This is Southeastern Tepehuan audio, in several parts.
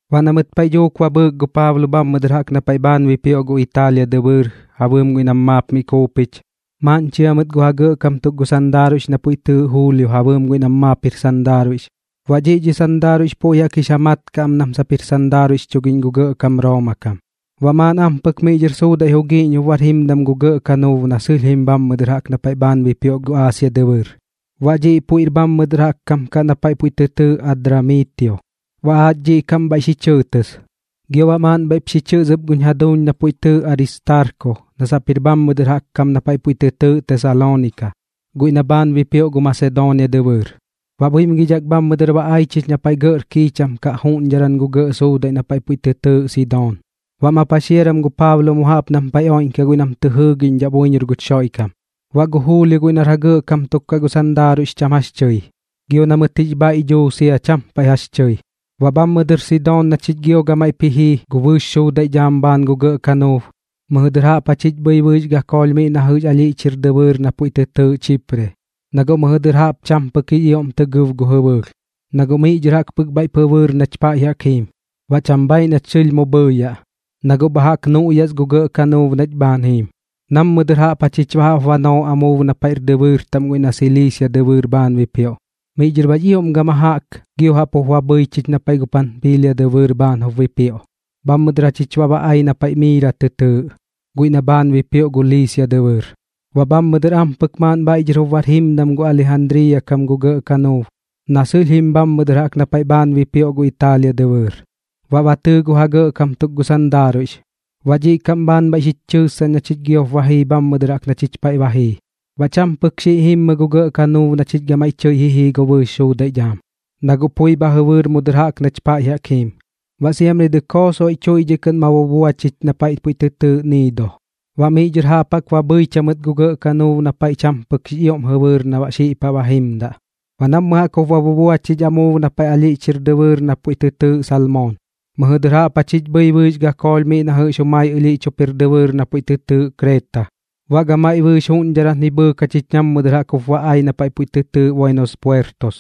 Baꞌ na mɨt paiꞌ dhuuk ba bhɨɨk gu Paablo bhammɨ dɨr jaꞌk na paiꞌ bhaan bipioꞌ gu Italia dɨbɨɨr ja bɨɨm guiꞌ nam maap mi kuupich, maaꞌn chia mɨt gu ja gɇꞌkam tuk gu sandaaruiꞌx na puiꞌ tɨɨꞌ Julio ja bɨɨm guiꞌ nam maap jir sandaaruiꞌx. Baꞌ dhiꞌ dhi sandaaruiꞌx puiꞌ jaꞌk jix ja mat kaꞌ am nam sap jir sandaaruiꞌx chugiꞌñ gu gɇꞌkam Rooma kam. Baꞌ maaꞌn ampɨk miꞌ dhɨr suudaiꞌ jugiiꞌñ jup bar jimdam gu gɇꞌ kanuub na sɨlh jim bhammɨ dɨr jaꞌk na paiꞌ bhaan bipioꞌ gu Aasia dɨbɨɨr, baꞌ dhiꞌ puiꞌr bhammɨ dɨr jaꞌk kam kaꞌ na paiꞌ puiꞌ tɨ tɨɨꞌ Adramiitio. Baꞌ aach dhiꞌ kaꞌm bhaan bhaiꞌ xi chɨɨtɨs, gio baꞌ maaꞌn bhaiꞌp xi chɨs ɨp guch jaduuñ na puiꞌ tɨɨꞌ Aristaarko na sap jir bhammɨ dɨr jaꞌk kam na paiꞌ puiꞌ tɨ tɨɨꞌ Tesaloonika, guiꞌ na bhaan bipioꞌ gu Masedoonia dɨbɨɨr. Baꞌ buimgidhak bhammɨ dɨr ba ai chich na paiꞌ gɇꞌr kiicham kaꞌ juꞌñdharan gu gɇꞌ suudaiꞌ na paiꞌ puiꞌ tɨ tɨɨꞌ Sidoon. Baꞌ ma paxiaram gu Paablo mu jaꞌp nam paiꞌ oiꞌñkaꞌ guiꞌ nam tɨ jɨɨgiꞌñdhaꞌ buiñor guch Xoiꞌkam. Baꞌ gu Julio guiꞌ nar ja gɇꞌkam tuk kaꞌ gu sandaaruiꞌx cham jax tɨi, gio na mɨt jix bhaiꞌ dhuu sia cham paiꞌ jax tɨi. Baꞌ bhammɨ dɨr Sidoon na chich gio gamaiꞌp ji jii gu bɨɨx suudaiꞌ dhaam bhaan gu gɇꞌ kanuub, mɨjɨ dɨr jaꞌp jachich bhɨi bɨɨx gakoolh miꞌ na jɨꞌx alhiꞌch jir dɨbɨɨr na puiꞌ tɨ tɨɨꞌ Chipre, na guꞌ mɨjɨ dɨr jaꞌp cham pɨk jix ioꞌm tɨ gɨb gu jɨbɨɨlh, na guꞌ miꞌ dhɨr jaꞌk pɨk bhaiꞌp jɨbɨɨr nach paiꞌ jaꞌk jiim, baꞌ cham bhaiꞌ nach sɨlh mu bhɨɨyaꞌ, na guꞌ bha jaꞌk nuꞌyas gu gɇꞌ kanuub nach bhaan jim. Nammɨ dɨr jachich baꞌ jaꞌp ba noo amuub na paiꞌr dɨbɨɨr taꞌm guiꞌ na Siliisia dɨbɨɨr bhaan bipioꞌ. Miꞌ dhɨr baꞌx ioꞌm gama jaꞌk gio jaꞌp jup ba bhɨi chich na paiꞌ gu Panpiilia dɨbɨɨr bhaan jup bipioꞌ. Bhammɨ dɨr jachich baꞌ ba ai na paiꞌ Miira tɨ tɨɨꞌ, guiꞌ na bhaan bipioꞌ gu Liisia dɨbɨɨr. Baꞌ bhammɨ dɨr ampɨk maaꞌn bhaiꞌ dhɨr jup bar jimdam gu Alijandriiya kam gu gɇꞌ kanuub na sɨlh jim bhammɨ dɨr jaꞌk na paiꞌ bhaan bipioꞌ gu Italia dɨbɨɨr. Baꞌ ba tɨɨ gu ja gɇꞌkam tuk gu sandaaruiꞌx, baꞌ dhiꞌ kaꞌm bhaan bhaiꞌ xich chɨɨssaꞌñ na chich giop ba jii bhammɨ dɨr jaꞌk na chich paiꞌ ba jii. Baꞌ cham pɨk xiꞌ jimmɨ gu gɇꞌ kanuub na chich gamaiꞌ tɨi ji jii gu bɨɨx suudaiꞌ dhaam, na guꞌ pui bha jɨbɨɨr mu dɨr jaꞌk nach paiꞌ jaꞌk jiim, baꞌ siamri dɨkoo soiꞌ tuiꞌdhiꞌ kɨꞌn ba bubua chich na paiꞌ puiꞌ tɨ tɨɨꞌ Niido. Baꞌ miꞌ dhɨr jaꞌp jaꞌk ba bhɨich jamɨt gu gɇꞌ kanuub na paiꞌ jaꞌk cham pɨk jix ioꞌm jɨbɨɨr na baꞌ xiꞌ paꞌ ba jimdaꞌ. Baꞌ nammɨ jaꞌk jup ba bubua chich amuub na paiꞌ ɨlhiꞌch jir dɨbɨɨr na puiꞌ tɨ tɨɨꞌ Salmoon, mɨjɨ dɨr jaꞌp jachich bhɨi bɨɨx gakoolh miꞌ na jɨꞌx jumai ɨlhiꞌch jup jir dɨbɨɨr na puiꞌ tɨ tɨɨꞌ Kreeta. Baꞌ gamaiꞌ bɨɨx juꞌñdharan ji bhɨɨk jachich nammɨ dɨr jup ba ai na paiꞌ puiꞌ tɨ tɨɨꞌ Buenos Puertos.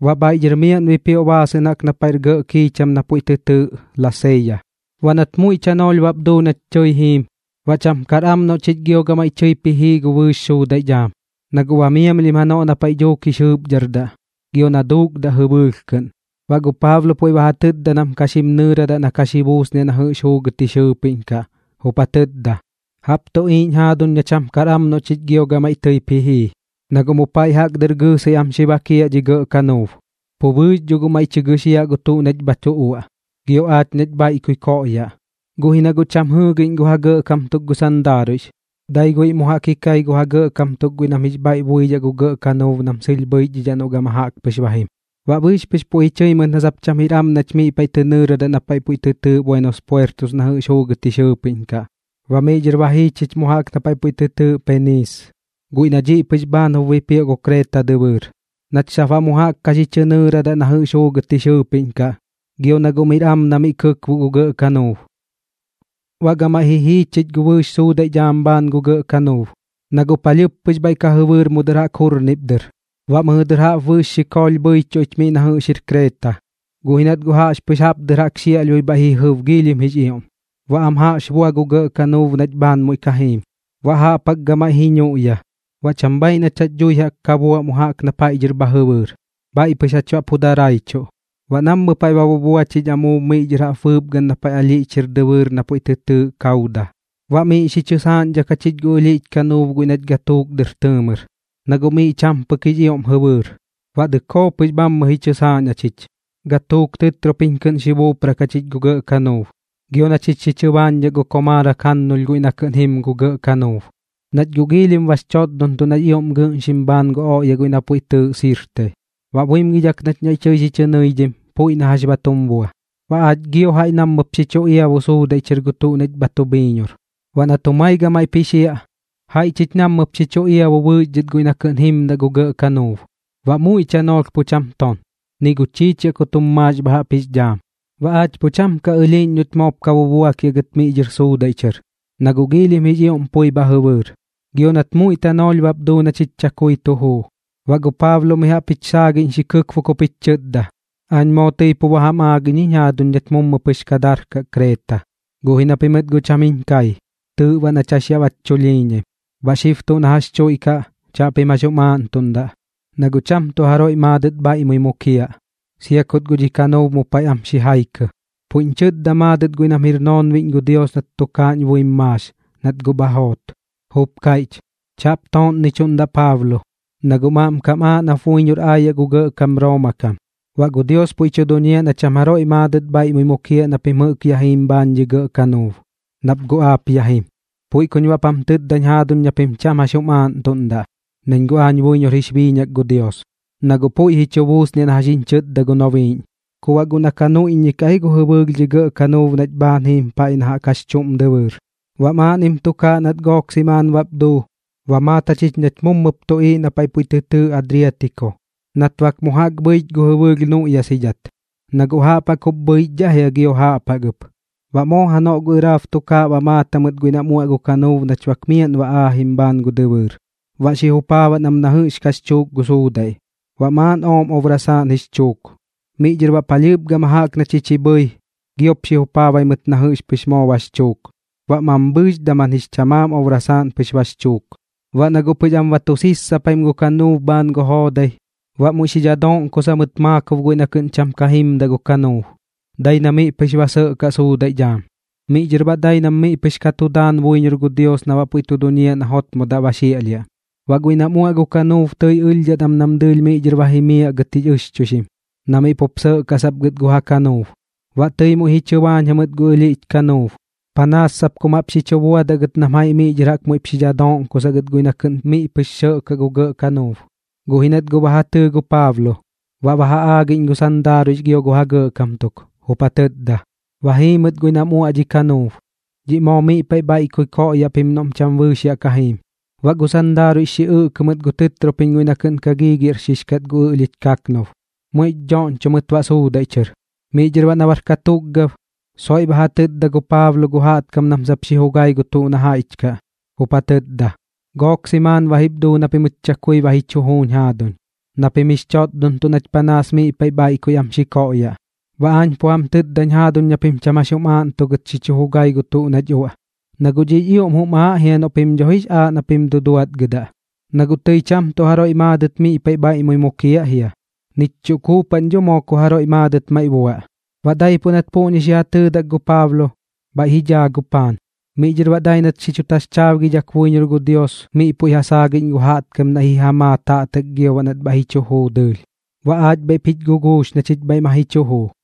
Baꞌ bhaiꞌ dhɨr miaꞌn bipioꞌ baasɨꞌn jaꞌk na paiꞌr gɇꞌ kiicham na puiꞌ tɨ tɨɨꞌ Laseeya. Baꞌ nat guꞌ muiꞌ tanoolh bap duu nach tɨi jiim, baꞌ cham kar am noꞌ chich gio gamaiꞌ tɨip ji jii gu bɨɨx suudaiꞌ dhaam, na guꞌ ba miamlhim janoꞌ na paiꞌ dhuuk jix jɨɨpdhardaꞌ gio na duukdaꞌ jɨbɨɨlh kɨꞌn. Baꞌ gu Paablo puiꞌ ba ja tɨtda nam ka xim nɨɨradaꞌ na ka xi buusniaꞌ na jɨꞌx juugɨt jix jɨɨpiꞌñ kaꞌ, jup ja tɨtda: ―Jaꞌp tu tuꞌiiꞌñ jaaduñ na cham kar am noꞌ chich gio gamaiꞌ tɨip ji jii, na guꞌ mu paiꞌ jaꞌk dɨr gɨɨsɨi am xi bakiaꞌ dhi gɇꞌ kanuub, pu bɨɨx dho guꞌ maiꞌ tɨ gɨxiaꞌ gu tuꞌ nach bha tu uaꞌ, gio aach nach bhaiꞌkui koꞌyaꞌ. Guꞌ ji na guꞌ cham jɨɨgiꞌñ gu ja gɇꞌkam tuk gu sandaaruiꞌx, dai guiꞌ mu jaꞌk ji kai gu ja gɇꞌkam tuk guiꞌ nam jix bhaiꞌ buidhaꞌ gu gɇꞌ kanuub nam sɨlh bhɨichdhidhaꞌ noꞌ gama jaꞌk pɨx jim. Baꞌ bɨɨx pɨx puiꞌ ji chɨi mɨt na sap cham jir am nach miꞌ tɨ nɨɨradaꞌ na paiꞌ puiꞌ tɨ tɨɨꞌ Buenos Puertos na jɨꞌx juugɨt jix jɨɨpiꞌñ kaꞌ. Baꞌ miꞌ dhɨr ba jii chich mu jaꞌk na paiꞌ puiꞌ tɨ tɨɨꞌ Peniis, guiꞌ na dhiꞌ pɨx bhaan jup bipioꞌ gu Kreeta dɨbɨɨr, nach sap baꞌ mu jaꞌk ka xi chɨ nɨɨradaꞌ na jɨꞌx juugɨt jix jɨɨpiꞌñ kaꞌ, gio na guꞌ miꞌr am na miꞌ kɨkboꞌ gu gɇꞌ kanuub. Baꞌ gamaiꞌ ji jii chich gu bɨɨx suudaiꞌ dhaam bhaan gu gɇꞌ kanuub, na guꞌ palhɨɨp pɨx bhaiꞌ ka jɨbɨɨr mu dɨr jaꞌk jurnip dɨr. Baꞌ mɨjɨ dɨr jaꞌp bɨɨx gakoolh bhɨichuꞌ ich miꞌ na jɨꞌx jir Kreeta. Guꞌ ji nat guꞌ jaꞌxpɨx jaꞌp dɨr jaꞌk xiaꞌlhbui bhaiꞌ ji jɨb giilhim jix ioꞌm, baꞌ am jaꞌx bua gu gɇꞌ kanuub nach bhaan muiꞌ ka jiim, baꞌ jaꞌp jaꞌk gamaiꞌ ji nuꞌya. Baꞌ cham bhaiꞌ nach jax dhui jaꞌk ka buaꞌ mu jaꞌk na paiꞌ dhɨr bha jɨbɨɨr, bhaiꞌ pɨx jach baꞌ pu daraichuꞌ. Baꞌ nammɨ paiꞌ ba bubua chich amuub miꞌ dhɨr jaꞌp bɨɨpgan na paiꞌ ɨlhiꞌch jir dɨbɨɨr na puiꞌ tɨ tɨɨꞌ Kauda. Baꞌ miꞌ xi chɨ saaꞌñdhak jachich gu ɨlhiꞌch kanuub guiꞌ nach gatuuk dɨr tɨɨmɨr, na guꞌ miꞌ cham pɨk jix ioꞌm jɨbɨɨr, baꞌ dɨkoo pɨx bhammɨ ji chɨsaaꞌñ jachich. Gatuuk tɨtropiñ kɨꞌn xi buuprak jachich gu gɇꞌ kanuub, gio na chich xi chɨbaañdhak gu komaarak jannulh guiꞌ na kɨꞌn jim gu gɇꞌ kanuub, nach guꞌ giilhim bax chotdontuꞌ nax ioꞌm gɨꞌnxim bhaan gu oꞌya guiꞌ na puiꞌ tɨɨꞌ Sirte. Baꞌ buimgidhak nach naiꞌ tɨi xi chɨ nɨidhim, puiꞌ na jax ba tum bua, baꞌ aach gio jaiꞌ nammɨp xi chu iabu suudaiꞌ chɨr gu tuꞌ nach bha tu bhiiñor. Baꞌ nat jumai gamaiꞌp ji xiaꞌ, jaiꞌ chich nammɨp xi chu iabu bɨɨx dhɨt guiꞌ na kɨꞌn jimmɨdaꞌ gu gɇꞌ kanuub. Baꞌ muiꞌ tanoolh pu cham ton, ni gu chiichiaꞌ kut jum maax bha jaꞌp jix dhaam, baꞌ aach pu cham ka ɨlhiiꞌñ noꞌch moop ka bubuakiaꞌ gɨt miꞌ dhɨr suudaiꞌ chɨr, na guꞌ giilhim jix ioꞌm pui bha jɨbɨɨr. Gio nat muiꞌ tanoolh bap duu na chich chakui tu juu, baꞌ gu Paablo mi jaꞌp jich saagiꞌñ xi kɨkbok jup jich chɨtda: ―Aañ moo tɨi pu ba jam aagiꞌñ jiñ jaaduñ nach gɨt mummɨ pɨx ka darkaꞌ Kreeta, guꞌ ji na pimɨt guꞌ cham jiñ kai. Tɨɨꞌ baꞌ nach jax yaꞌ bach chulhiiñaim. Baꞌ xib tuꞌ na jax chuiꞌkaꞌ, chaꞌpim jax jum aaꞌntuꞌndaꞌ, na guꞌ cham tuꞌ jaroiꞌ maadɨt bhaiꞌmui mukiaꞌ, sia kut guꞌ dhi kanuub mu paiꞌ am xi jaikɨ. Puiꞌñ chɨtda maadɨt guiꞌ nam jir noonbiꞌñ gu Dios nat tukaaꞌñ buim maax, nat guꞌ bha joot, jup kaiꞌch: “Chaꞌp tooꞌnnichuꞌndaꞌ Paablo, na guꞌm aꞌmkam aaꞌ nap buiñor aayaꞌ gu gɇꞌkam Rooma kam. Baꞌ gu Dios puiꞌ tu duñiaꞌ na cham jaroiꞌ maadɨt bhaiꞌmui mukiaꞌ na pim jɨꞌk yaꞌ jiim bhaan dhi gɇꞌ kanuub, nap guꞌ aap ya jim.” Puiꞌ kuñ baꞌp jam tɨtdañ jaaduñ na pim cham jax jum aaꞌntuꞌndaꞌ, nañ guꞌ aañ buiñor jix biiñak gu Dios, na guꞌ puiꞌ ji chu buusniaꞌ na jax jiñ chɨtda gu nobiiꞌñ. Ku baꞌ guꞌ na ka nuiꞌññikaꞌ ji gu jɨbɨɨlh dhi gɇꞌ kanuub nach bhaan jiim paiꞌ na jaꞌk jax chuꞌm dɨbɨɨr. Baꞌ maaꞌnnim tukaaꞌ nat gook simaan bap duu, ba maat jachich nach mummɨp tuꞌiiꞌ na paiꞌ puiꞌ tɨ tɨɨꞌ Adriatiko, nat bak mu jaꞌk bhɨich gu jɨbɨɨlh nuꞌyasidhat, na guꞌ jaꞌp jaꞌk jup bhɨichdhaꞌ jia gio jaꞌp jaꞌk ɨp. Baꞌ moo janoꞌ gu ɨraab tukaaꞌ ba maat jamɨt guiꞌ nam uaꞌ gu kanuub nach bak miaꞌn ba aajim bhaan gu dɨbɨɨr. Baꞌ xi jupaabaꞌn am na jɨꞌx kax chuuk gu suudaiꞌ, baꞌ maaꞌn ooꞌm obrasaaꞌn jix chuuk. Miꞌ dhɨr baꞌ palhɨɨp gama jaꞌk na chich ji bhɨi, giop xi jupaabai mɨt na jɨꞌx pɨx moo bax chuuk, baꞌ mambhɨɨx daman jix chamaam obrasaaꞌn pɨx bax chuuk. Baꞌ na guꞌ pɨx am ba tu sissapim gu kanuub bhaan gu joodai, baꞌ muiꞌ xi dhadoꞌnkosa mɨt maakob guiꞌ na kɨꞌn cham ka jimdaꞌ gu kanuub, dai na miꞌ pɨx ba sɇꞌkaꞌ suudaiꞌ dhaam. Miꞌ dhɨr baꞌ dai nam miꞌ pɨx ka tu daan buiñor gu Dios na baꞌ puiꞌ tu duñiaꞌ na jotmodaꞌ ba xiaꞌlhiaꞌ. Baꞌ guiꞌ nam uaꞌ gu kanuub tɨi ɨlhdhat am nam dɨɨlh miꞌ dhɨr ba jimiaꞌ gɨt jix ɨxchuixim, na miꞌ pup sɇꞌkaꞌ sap gɨt gu ja kanuub. Baꞌ tɨi muiꞌ ji chɨbaañ jamɨt gu ɨlhiꞌch kanuub, panaas sap kum jaꞌp xi chu buadaꞌ gɨt nam jaiꞌ miꞌ dhɨr jaꞌk muiꞌp xi dhadoꞌnkosaꞌ gɨt guiꞌ na kɨꞌn miꞌ pɨx sɇꞌkaꞌ gu gɇꞌ kanuub. Guꞌ ji nat guꞌ ba ja tɨɨ gu Paablo, baꞌ ba ja aagiꞌñ gu sandaaruiꞌx gio gu ja gɇꞌkam tuk, jup ja tɨtda: ―Ba jii mɨt guiꞌ nam uaꞌ dhi kanuub. Dhiꞌ moo miꞌ paiꞌ bhaiꞌkui koꞌyaꞌ pim noꞌm cham bɨɨx yaꞌ ka jiim. Baꞌ gu sandaaruiꞌx xi ɨꞌkɨ mɨt gu tɨtropiñ guiꞌ na kɨꞌn ka gigiaꞌrxix kat gu ɨlhiꞌch kanuub, muiꞌ dhoꞌñcho mɨt baꞌ suudaiꞌ chɨr. Miꞌ dhɨr baꞌ na bar katukgab, soiꞌ ba ja tɨtda gu Paablo gu jaꞌtkam nam sap xi jugai gu tuꞌ na jaiꞌch kaꞌ, jup ja tɨtda: ―Gook simaan ba jip duu na pimɨt chakui ba ji chu juuñ jaaduñ, na pim jix chotdontuꞌ nach panaas miꞌ paiꞌ bhaiꞌkui am xi koꞌyaꞌ. Baꞌ aañ pu jam tɨtdañ jaaduñ na pim cham jax jum aaꞌntugɨt xi chu jugai gu tuꞌ nach uaꞌ, na guꞌ dhiꞌx ioꞌm jum aaꞌ jia noꞌ pim dho jix aaꞌ na pim duduatgɨdaꞌ. Na guꞌ tɨi cham tuꞌ jaroiꞌ maadɨt miꞌ paiꞌ bhaiꞌmui mukiaꞌ jia, nich chuꞌ kuupaꞌn dho moo ku jaroiꞌ maadɨt maiꞌ buaꞌ. Baꞌ daipuꞌ nat puꞌñi xi ja tɨɨdak gu Paablo, bhaiꞌ ji dhaa gu paan. Miꞌ dhɨr baꞌ dai nat xi chu taxchaabgidhak buiñor gu Dios miꞌ puiꞌ ja saagiꞌñ gu jaꞌtkam naiꞌ xi ja maa taꞌtak gio baꞌ nat bhaiꞌ ji chu juu dɨɨlh. Baꞌ aach bhaiꞌp jich guguux na chich ma ji chu juu.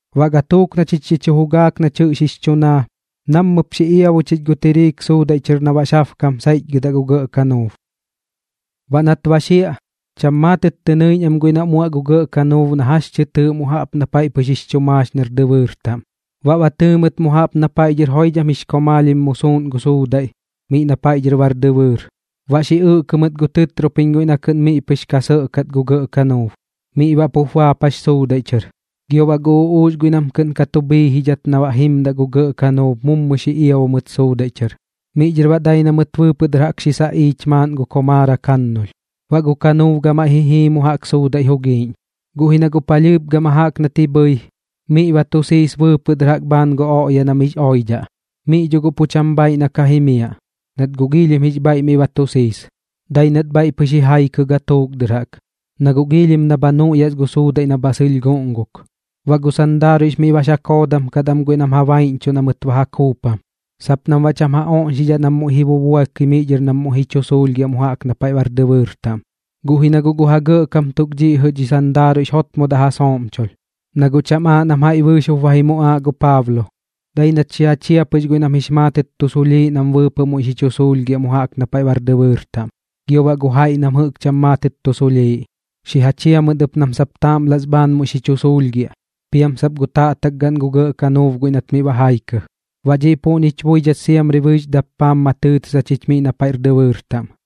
Baꞌ gatuuk na chich xi chu jugaak nach jɨꞌx jix chu naa, nammɨp xi iabu chich gu tiriik suudaiꞌ chɨr na baꞌx jabkam saiꞌchgɨdaꞌ gu gɇꞌ kanuub. Baꞌ nat ba xiaꞌ, cham maatɨt tɨ nɨiꞌñ am guiꞌ nam uaꞌ gu gɇꞌ kanuub na jax tɨ tɨɨꞌ mu jaꞌp na paiꞌ pɨx jix chu maax nar dɨbɨɨr taꞌm, baꞌ ba tɨɨ mɨt mu jaꞌp na paiꞌ dhɨr joidham jix komaalhim mu suuꞌn gu suudaiꞌ miꞌ na paiꞌ dhɨr bar dɨbɨɨr. Baꞌ xi ɨꞌkɨ mɨt gu tɨtropiñ guiꞌ na kɨꞌn miꞌ pɨx ka sɇꞌkat gu gɇꞌ kanuub, miꞌ baꞌ pup baapax suudaiꞌ chɨr. Gio baꞌ gu uꞌuux guiꞌ nam kɨꞌn ka tu bhiijidhat na baꞌ jimdaꞌ gu gɇꞌ kanuub mummɨ xi iabu mɨt suudaiꞌ chɨr. Miꞌ dhɨr baꞌ dai na mɨt bɨɨpɨꞌ dɨr jaꞌk xi saꞌiich maaꞌn gu komaarak jannulh, baꞌ gu kanuub gamaiꞌ ji jii mu jaꞌk suudaiꞌ jugiiꞌñ. Guꞌ ji na guꞌ palhɨɨp gama jaꞌk nat ji bhɨi, miꞌ ba tu siis bɨɨpɨꞌ dɨr jaꞌk bhaan gu oꞌya na miꞌx oidhaꞌ. Miꞌ dho guꞌ pu cham bhaaiꞌ na ka jimiaꞌ, nat guꞌ giilhim jix bhaiꞌ miꞌ ba tu siis. Dai nat bhaiꞌ pɨx ji jaikɨ gatuuk dɨr jaꞌk, na guꞌ giilhim na bha nuꞌyas gu suudaiꞌ na bha sɨlh guꞌnguk. Baꞌ gu sandaaruiꞌx miꞌ bax ja koodam kat am guiꞌ nam ja baiꞌñchuꞌ na mɨt ba ja kuupam, sap nam baꞌ cham ja oꞌñxidhaꞌ nam ji bubuakɨi miꞌ dhɨr nam muiꞌ ji chu suulhgiaꞌ mu jaꞌk na paiꞌr dɨbɨɨr taꞌm. Guꞌ ji na guꞌ gu ja gɇꞌkam tuk dhiꞌ jɨꞌ dhi sandaaruiꞌx jotmodaꞌ ja sooꞌmchulh, na guꞌ cham aaꞌ nam jaiꞌ bɨɨx jup ba ji muꞌaaꞌ gu Paablo. Dai nat xi ja chia pɨx guiꞌ nam jɨꞌk jix maatɨt tu suulhiꞌ nam bɨɨpɨꞌ muiꞌ xi chu suulhgiaꞌ mu jaꞌk na paiꞌr dɨbɨɨr taꞌm. Gio baꞌ gu jaiꞌ nam jɨꞌk cham maatɨt tu suulhiꞌ, xi ja chia ɨp nam sap taaꞌmlas bhaan muiꞌ xi chu suulhgiaꞌ, piam sap gu taꞌtak gaꞌn gu gɇꞌ kanuub guiꞌ nat miꞌ ba jaikɨ. Baꞌ dhiꞌ puꞌñich buidhat siamri bɨɨx dappaam ma tɨɨtɨs jachich miꞌ na paiꞌr dɨbɨɨr taꞌm.